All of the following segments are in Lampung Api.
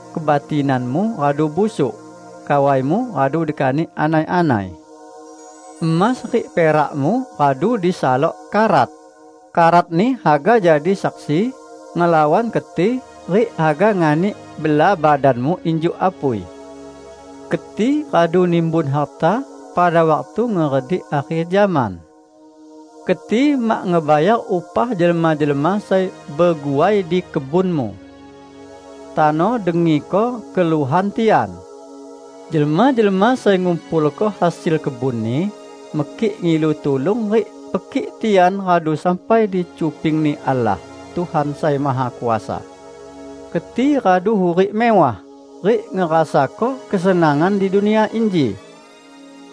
Kebatinanmu radu busuk. Kawaimu radu dikanik anai-anai. Emas rik perakmu radu disalok karat; karatni haga jadi saksi ngelawan keti rik haga nganik bela badanmu injuk apui. Keti radu nimbun harta pada waktu ngeredik akher zaman. Keti mak ngebayar upah jelma-jelma sai beguai di kebunmu. Tano dengiko keluhan tian! Jelma-jelma sai ngumpulko hasil kebunni, mekik ngilu tulung rik pekik tian radu sampai di cuping-Ni Allah, Tuhan Sai Mahakuasa. Keti radu hurik mewah rik ngerasako kesenangan di dunia inji.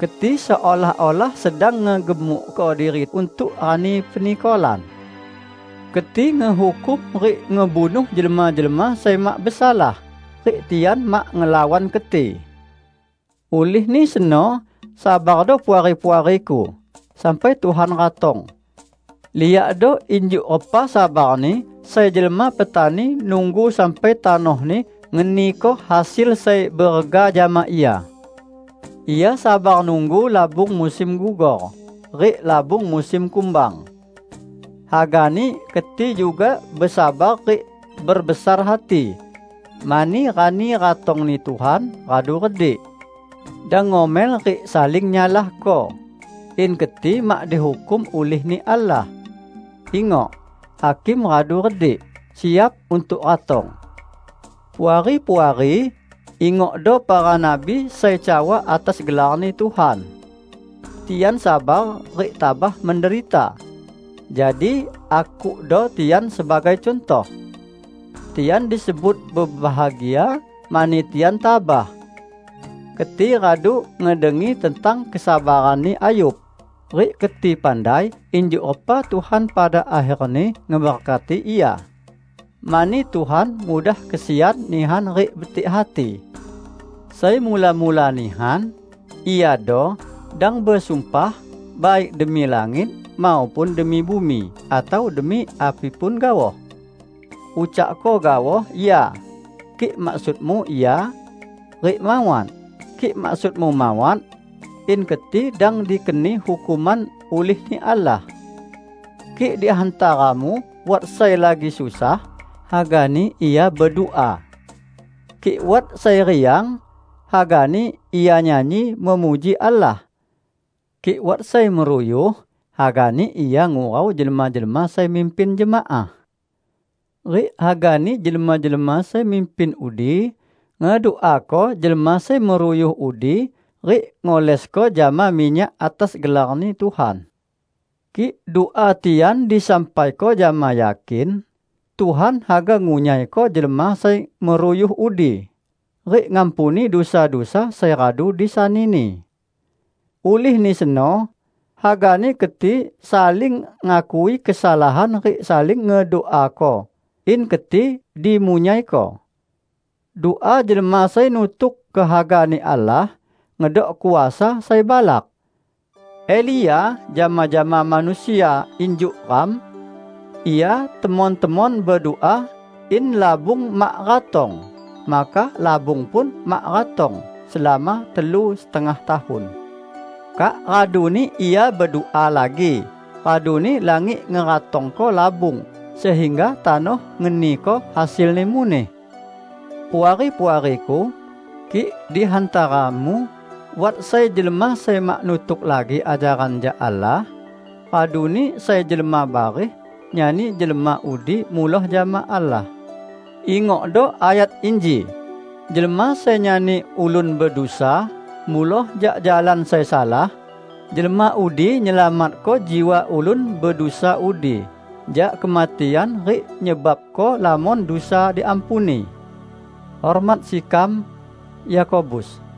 Keti seolah-olah sedang ngegemukko diri untuk rani penikolan. Keti ngehukum rik ngebunuh jelma-jelma sai mak besalah, rik tian mak ngelawan keti. Ulihni seno, sabardo Puari-puariku, sampai Tuhan ratong. Liakdo injuk repa sabarni sai jelma petani nunggu sampai tanohni ngeniko hasil sai berega jama ia. Ia sabar nunggu labung musim gugor rik labung musim kumbang. Hagani keti juga besabar rik berbesar hati, mani rani ratongni Tuhan radu redik. Dang ngomel rik saling nyalahko, in keti mak dihukum ulih-Ni Allah. Ingok! Hakim radu redik, siap untuk ratong. Puari-puari ingokdo para nabi sai cawa atas gelar-Ni Tuhan. Tian sabar rik tabah menderita. Jadi, akukdo tian sebagai cuntoh. Tian disebut bebahagia mani tian tabah. Keti radu ngedengi tentang kesabaranni Ayub, rik keti pandai injuk repa Tuhan pada akherni ngeberkati ia. Mani Tuhan mudah kesian nihan rik betik hati. Sai mula-mula nihan, iado: Dang besumpah, baik demi langit, maupun demi bumi atau demi api pun gaoh. Ucakko gaoh "Ya" kik maksudmu ya, rik "Mawat" kik maksudmu mawat; in keti dang dikeni hukuman ulih-Ni Allah. Kik di hantaramu wat sai lagi susah, hagani ia bedua. Kik wat sai riang, hagani ia nyanyi memuji Allah. Kik wat sai meruyuh, hagani ia ngurau jelma-jelma sai mimpin jemaah. Rik hagani jelma-jelma sai mimpin udi ngeduako jelma sai meruyuh udi rik ngolesko jama minyak atas gelar-Ni Tuhan. Kik dua tian disampaiko jama yakin, Tuhan haga ngunyaiko jelma sai meruyuh udi, rik ngampuni dusa-dusa sai radu disanini. Ulihni seno, hagani keti saling ngakui kesalahan rik saling ngeduako, in keti dimunyaiko. Dua jelma sai nutuk kehaga-Ni Allah, ngedok kuasa sai balak. Elia jama-jama manusia injuk ram. Ia temon-temon bedua in labung mak ratong, maka labung pun mak ratong selama telu setengah tahun. Kak raduni ia bedua lagi, raduni langit ngeratongko labung sehingga tanoh ngeniko hasilni muneh. Puari-puariku! Kik di hantaramu wat sai jelma sai mak nutuk lagi ajaran jak Allah, raduni sai jelma bareh nyani jelma udi muloh jama Allah, ingokdo ayat inji: Jelma sai nyani ulun bedusa muloh jak jalan sai salah, jelma udi nyelamatko jiwa ulun bedusa udi jak kematian rik nyebabko lamon dusa diampuni. Hormat sekam, Yakobus